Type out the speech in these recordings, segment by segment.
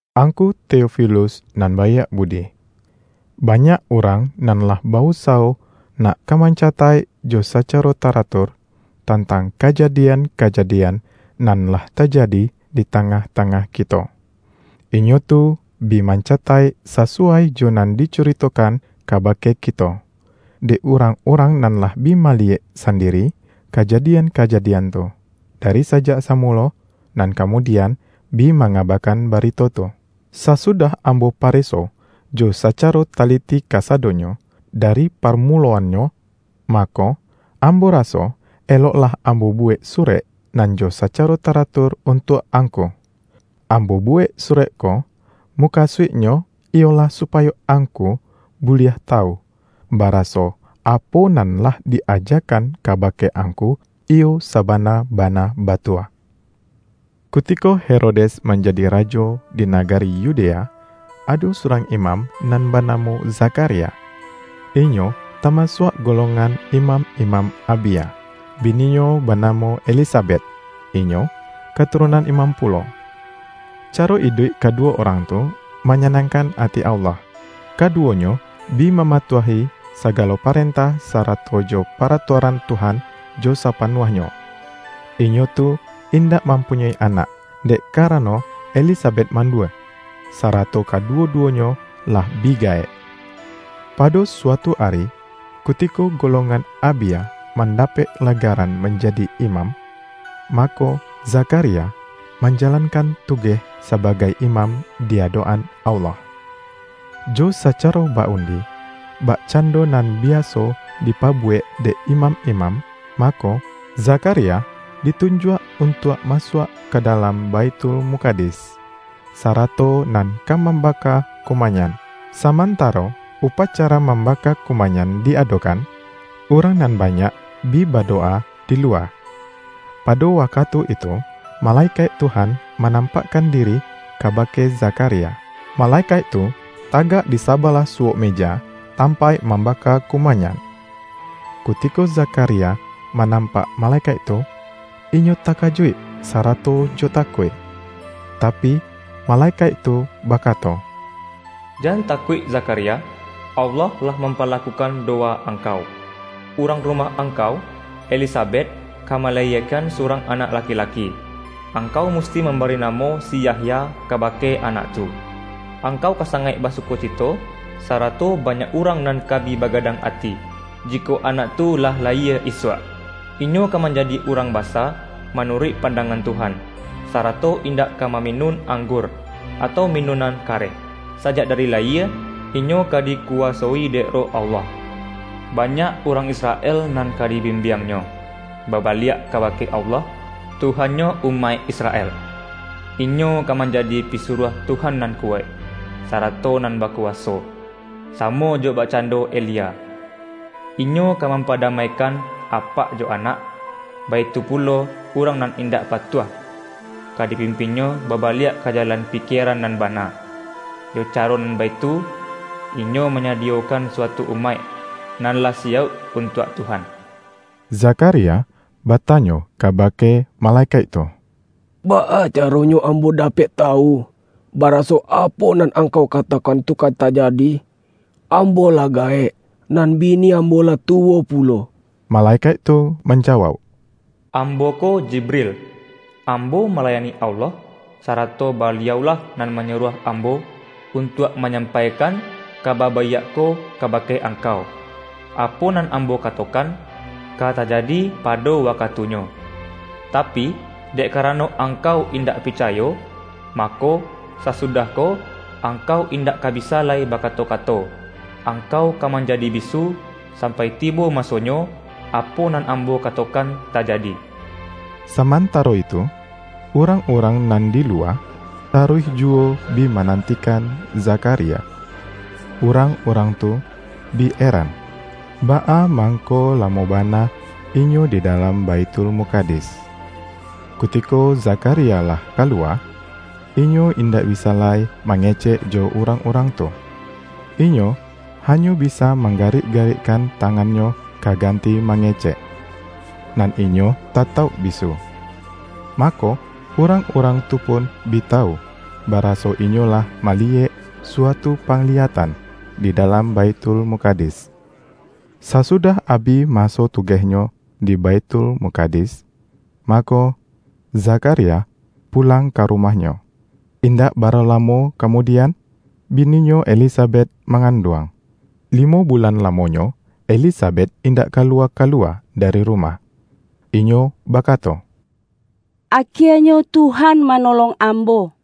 Angku Teofilus nan baiak budi, Banyak urang nan lah ba-usawo nak ka mancataik jo sacaro taratur, tantang kajadian-kajadian nan lah ta-jadi di tangah-tangah kito. Inyo tu bi mancataik sasuwai jo nan dicuritokan kabake kito, dek urang-urang nan lah bi maliyek sandiri, kajadian-kajadian tu, dari sajak samulo, nan kamudian, bi mangabakan barito tu. Sasudah am-bo pareso jo sacaro taliti kasadonyo, dari parmuloannyo, mako, ambo ra-so, eloklah ambo buwek surek nan jo sacaro taratur untuak angku. Ambo buwek surek ko, mukasuiknyo iyolah supayo angku buliah tawu, baraso apo nan lah di-ajakan kabake angku, iyo sabana-bana batua. Kutiko Herodes manjadi rajo di na-gari Yudea, ado surang imam nan ba-namo Zakharia. Inyo tamasuak golong-an imam-imam Abia. Bininyo banamo Elisabet, inyo katurunan imam pulo. Caro iduik kaduwo urang tu, manya-nangkan ati Allah. Kaduwonyo bi ma-matuahi sagalo parentah, sarato jo pa-ratuaran Tuhan, jo sapanuahnyo. Inyo tu indak mampunyoi anak, dek kara-no Elisabet mandua, sarato kaduwo-duwonyo lah bi gaek. Pado suatu ari, kutiko golongan Abia mandapek legaran manjadi imam, ma-ko, Zakharia manjalankan tugeh saba-gai imam di adok-an Allah. Jo sacaro ba-undi, bakcando nan biaso dipabuwek dek imam-imam, mako, Zakha-ria ditunjuak untuak masuak ka dalam Baithulmukadis, sarato nan ka mam-baka kumayan. Samantaro upacara mambaka kumayan di adokan, urang nan banyak bi badowa di luwa. Pado wakatu itu, malekaik Tuhan manam-pakkan diri kabake Zakharia. Male-kaik tu tagak di sabalah suwok meja tampaik mambaka kumayan. Kutiko Zakharia manampak malekaik tu, inyo takajuik sarato jo takuik. Tapi, male-kaik tu bakato,”Jan takuik Zakharia! Allah lah mampalakukan dowa ang-kau. Urang rumah angkau, Elisabet ka malayiekan surang anak laki-laki. Ang-kau musti mambari namo si Yahya ka-bake anak tu. Angkau ka sangaik ba-sukocito, sarato banyak urang nan ka bi bagadang ati, jikok anak tu lah la-yie isuak! Inyo ka manjadi urang ba-sa manuruik pandangan Tuhan, sarato indak ka maminun anggur, atau minun-an kareh. Sajak dari layie, inyo ka diku-wasoi dek Roh Allah. Banyak urang Israel nan ka dibimbiangnyo, babaliak kabake Allah, Tuhan-nyo umaik Israel. Inyo ka manjadi pisuruah Tuhan nan kuwaik, sarato nan bakuwaso, samo jo bakcando Elia. Inyo ka mampadamai-kan apak jo anak, baitu pulo, urang nan indak patuah, ka dipimpinnyo babaliak ka jalan pikieran nan bana. Jo caro nan baitu, inyo manyadiyokan suatu umaik, nan lah siyauk untuak Tuhan.” Zakharia batanyo kabake male-kaik tu,”Baa caronyo ambo dapek ta-wu, baraso, apo nan angkau katokan tu ka tajadi? Ambo lah gaek, nan bi-ni ambo lah tuwo pulo.” Malekaik tu manjawauk,”Ambo ko Jibril. Ambo malayani Allah, sara-to Baliau-lah nan manyuruah ambo, untuak manyampaikan kaba baiak ko kabake angkau. Apo nan ambo ka-tokan, ka tajadi pado wakatunyo. Ta-pi, dek karano angkau indak picayo, mako, sasudah ko, angkau indak ka bisa lai bakato-kato; angkau ka man-jadi bisu, sampai tibo masonyo, apo nan ambo katokan tajadi.” Samantaro itu, urang-urang nan di luwa, taruih juwo bi manantikan Zakharia. Urang-urang tu bi eran, baa mangko lamo bana inyo di da-lam Baithulmukadis. Kutiko Zakha-ria lah kaluwa, inyo indak bisa lai ma-ngecek jo urang-urang tu. Inyo hanyo bisa manggarik-garikkan tangannyo ka ganti mangecek, nan inyo tatauk bisu. Mako, urang-urang tu pun bi tawu, ba-raso inyo lah maliyek suatu pangliya-tan di dalam Baithulmukadis. Sasudah abih maso tugehnyo di Baithulmukadis, mako, Zakharia pulang ka rumahnyo. Indak bara lamo kamu-dian, bininyo Elisabet, manganduang. Limo bulan lamonyo, Elisabet indak ka-luwa-kaluwa dari rumah. Inyo baka-to,”Akienyo Tuhan manolong ambo,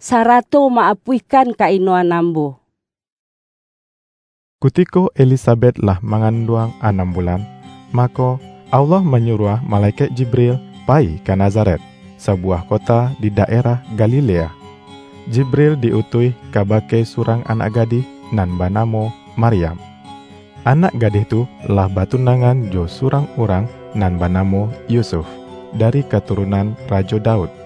sa-rato ma-apuihkan ka-inoan ambo.” Kutiko Elisabet lah manganduang anam bulan, mako, Allah manyuruah malekaik Jibril payi ka Nazaret, sabu-wah kota di daerah Galilea. Jibril di-utuih kabake surang anak gadih, nan banamo Maryam. Anak gadih tu lah batunangan jo surang urang nan banamo Yusuf, dari katurunan Ra-jo Daud.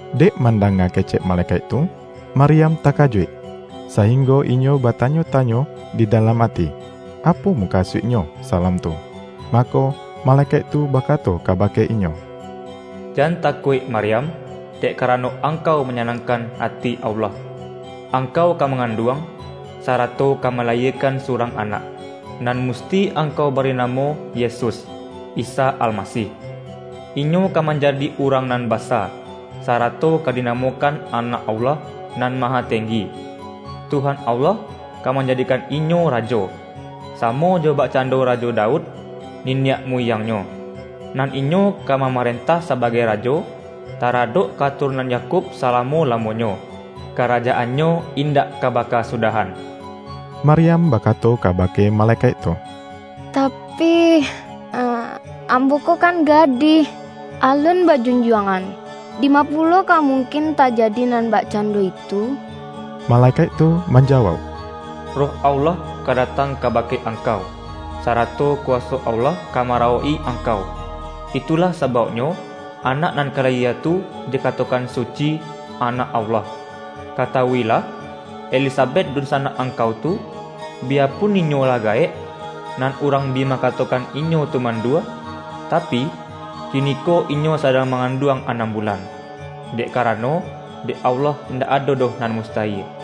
Dek mandanga kecek malekaik tu, Maryam takajuik, sainggo inyo bata-nyo-tanyo di dalam ati, apo mukasuik-nyo salam tu. Mako, malekaik tu ba-kato kabake inyo,”Jan takuik Maryam, dek karano angkau manyanangkan ati Allah. Angkau ka manganduang, sa-rato ka malayiekan surang anak, nan musti angkau bari namo Yesus, (Isa Almasih). Inyo ka manjadi urang nan basa, sarato ka dinamokan Anak Allah Nan Mahatenggi. Tuhan Allah ka man-jadikan Inyo Rajo, samo jo bakcando Rajo Daud, niniak muyang-Nyo. Nan Inyo ka mamarentah sabagai Rajo, ta-radok katurunan Yakub salamo-lamo-nyo. Karajaan-Nyo indak ka bakasu-dahan.” Maryam bakato kabake malekaik tu,”Tapi, ambo ko kan gadih, alun ba-junjuangan, dima pulo ka mungkin ta-jadi nan bakcando itu?” Malekaik tu manjawauk,”Roh Allah ka datang kabake angkau, sa-rato kuwaso Allah ka marawok-i ang-kau. Itulah sabauknyo, Anak nan ka layie tu dikatokan Suci, Anak Allah. Katawuilah: Elisabet dunsanak ang-kau tu, biyapun inyo lah gaek, nan urang bi mangatokan inyo tu mandua, tapi, kiniko inyo sadang manganduang anam bulan. Dek karano, dek Allah indak ado doh nan mustayie.”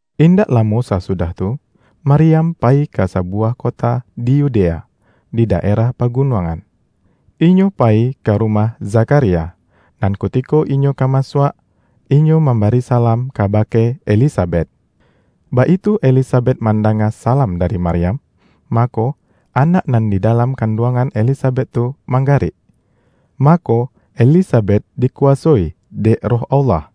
Indak lamo sasudah tu, Maryam payi ka sabuwah kota di Yudea, di da-erah pagunuangan. Inyo payi ka rumah Zakharia, nan kutiko inyo ka masuak, inyo mambari salam kaba-ke Elisabet. Baitu Elisabet manda-nga salam dari Maryam, mako, anak nan di dalam kanduangan Elisabet tu, manggarik. Mako, Elisabet dikuwasoi dek Roh Allah,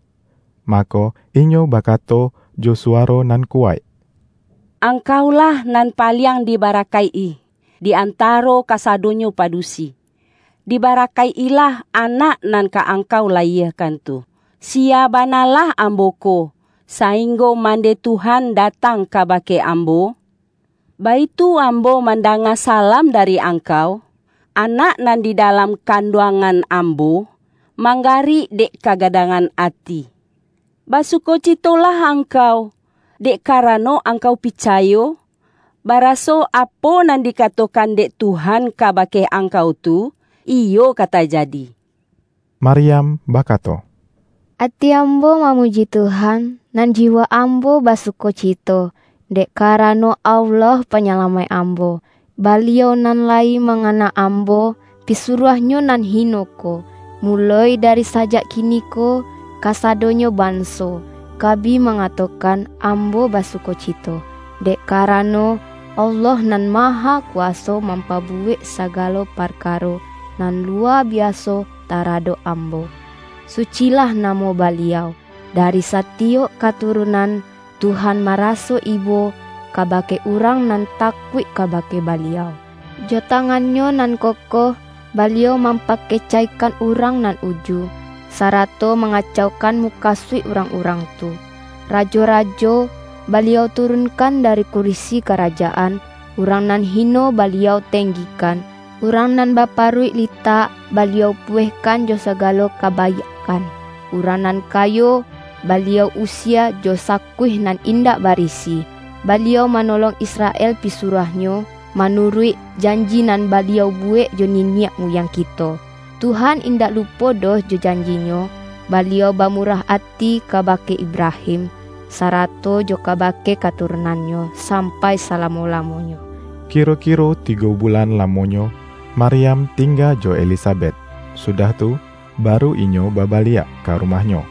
mako, inyo bakato jo suwaro nan kuwaik,”Angkaulah nan paliang di barakaik-i, di antaro kasado-nyo padusi! Dibarakaik-ilah Anak nan ka angkau layiekan tu! Siya banalah ambo ko, sainggo mandeh Tuhan da-tang kabake ambo? Baitu ambo man-danga salam dari angkau, anak nan di dalam kanduangan ambo, manggarik dek kagadangan ati. Basukocitolah angkau, dek karano angkau picayo, ba-raso, apo nan dikatokan dek Tuhan ka-bake angkau tu, iyo, ka tajadi!” Maryam bakato,”Ati ambo mamuji Tuhan, nan jiwa ambo basukocito, dek karano Allah Panyalamaik ambo. Baliau nan layi mangana ambo, Pisuruah-Nyo nan hino ko! Muloi dari sajak kiniko, kasadonyo banso, ka bi mangatokan, ambo basukocito. Dek karano, Allah Nan Mahakuwaso, mampabuwek sagalo parkaro nan luwa biaso taradok ambo. Sucilah namo Baliau. Dari satiyok katurunan, Tuhan maraso ibo, kabake urang nan takuik kabake Baliau. Jo tangan-Nyo nan kokoh, Baliau mampakecaikan urang nan uju, sarato mangacaukan mukasuik urang-urang tu. Rajo-rajo, Baliau turunkan dari kurisi karajaan, urang nan hino, Baliau tenggikan. Urang nan baparuik litak, Baliau puwehkan jo sagalo kabaiakkan, urang nan kayo, Baliau usie jo sakuih nan indak barisi. Baliau manolong Israel pisuruah-Nyo, manuruik janji nan Baliau buwek jo niniak muyang kito. Tuhan indak lupo doh jo janji-Nyo, Baliau bamurah ati kabake Ibrahim, sarato jo kabake katurunannyo, sampai salamo-lamonyo.” Kiro-kiro tigo bulan lamonyo, Mar-yam tingga jo Elisabet, sudah tu, baru inyo babaliak ka rumahnyo.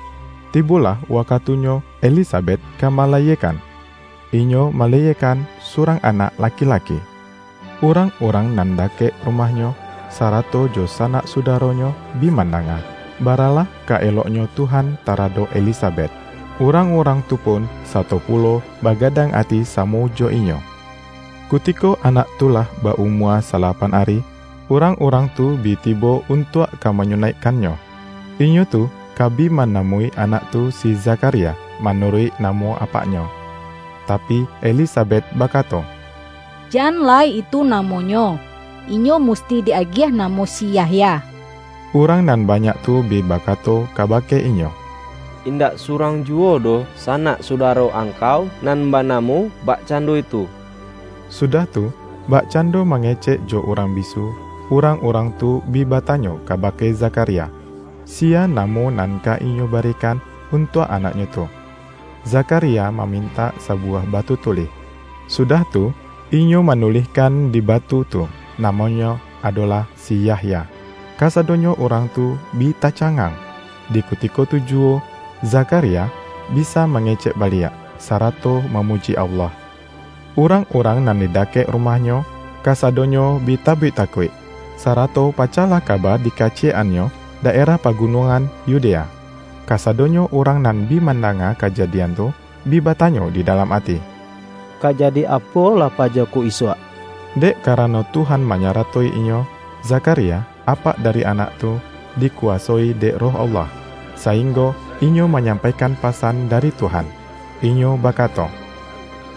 Tibolah wakatunyo Elisabet ka malayiekan. Inyo malayiekan surang anak laki-laki. Urang-urang nan da-kek rumahnyo, sarato jo sanak sudaro-nyo bi mandanga, bara lah ka eloknyo Tuhan taradok Elisabet, urang-urang tu pun sato pulo bagadang ati samo jo inyo. Kutiko anak tu lah ba-umua sa-lapan ari, urang-urang tu bi tibo un-tuak ka manyunaikkannyo. Inyo tu ka bi manamoi anak tu si Zakharia, ma-nuruik namo apaknyo, tapi, Elisa-bet bakato,”Jan lai itu namonyo! Inyo musti di-agiah namo si Yahya.” Urang nan banyak tu bi baka-to kabake inyo,”Indak surang juwo doh sanak sudaro angkau nan bana-mo bakcando itu.” Sudah tu, bak-cando mangecek jo urang bisu, urang-urang tu bi batanyo kabake Zakharia, siya namo nan ka inyo barikan untuak anaknyo tu. Zakharia mamintak sabuwah batu tulih, sudah tu, inyo manulihkan di batu tu,”Namonyo adolah si Yahya.” Kasadonyo urang tu bi tacangang. Di kutiko tu juwo, Zakharia bisa mangecek baliak, sarato mamuji Allah. Urang-urang nan di dakek rumahnyo, kasadonyo bi tabik takuik, sarato pacahlah kaba di-kaciyek-annyo daerah pagunuangan Yu-dea. Kasadonyo urang nan bi manda-nga kajadian tu, bi batanyo di dalam ati,”Ka jadi apolah paja ko isuak?” Dek ka-rano Tuhan manyarato-inyo. Zakharia, apak dari anak tu, di-kuwasoi dek Roh Allah, sainggo inyo manyampaikan pasan dari Tuhan. Inyo bakato,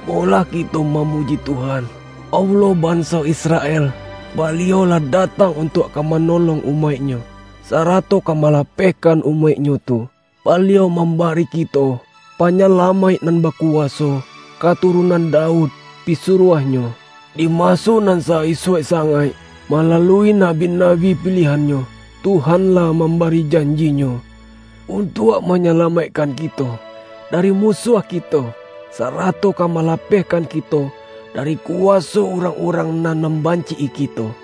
”Molah kito mamuji Tuhan, Allah banso Israel! Baliau lah datang untuak ka manolong umaik-Nyo, sarato ka malapehkan umaik-Nyo tu. Baliau mambari kito, Panyalamaik nan bakuwaso, katurunan Daud, pisuruah-Nyo. Di maso nan sa-isuak sangaik, malalui nabi-nabi pilihan-Nyo, Tuhan lah mambari janji-Nyo, untuak manyalamaikkan kito, dari musuah kito, sarato ka malapehkan kito, dari kuwaso urang-urang nan mambanci-i kito.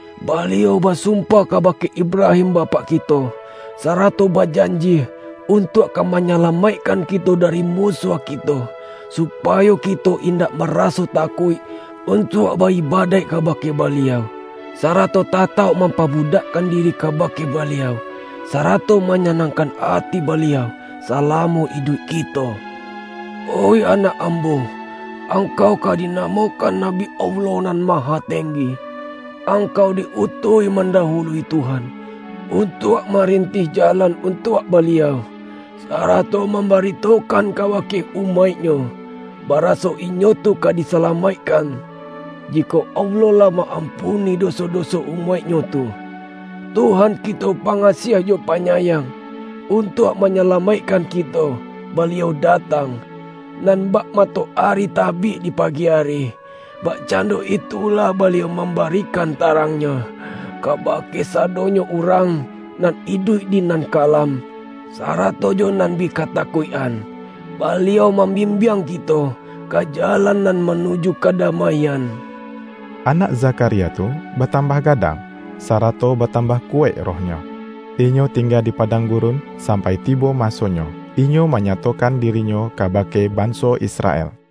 Baliau basumpah kabake Ibrahim bapak kito, sarato bajanji, untuak ka manyalamaikkan kito dari musuah kito, supayo kito indak maraso takuik, untuak ba-ibadaik kabake Baliau, sarato tatauk mampabudakkan diri kabake Baliau, sarato manyanangkan ati Baliau, salamo iduik kito. Oih anak ambo, angkau ka dinamokan nabi Allah Nan Mahatenggi. Angkau di-utuih mandawului Tuhan, untuak marintih jalan untuak Baliau, sarato mambaritokan kabake umaik-Nyo, baraso inyo tu ka disalamaikkan, jikok Allah lah ma-ampuni doso-doso umaik-Nyo tu. Tuhan kito pangasiah jo panyayang; untuak manyalamaikkan kito, Baliau datang. Nan bak matoari tabik di pagi ari, bakcando itulah Baliau mambarikan tarang-Nyo, kabake sadonyo urang, nan iduik di nan kalam, sarato jo nan bi katakuik-an. Baliau mambimbiang kito, ka jalan nan manuju kadamaian.” Anak Zakharia tu, batambah ga-dang, sarato batambah kuwaik rohnyo. Inyo tingga di padang gurun, sampai tibo masonyo, inyo manyatokan diri-nyo kabake banso Israel.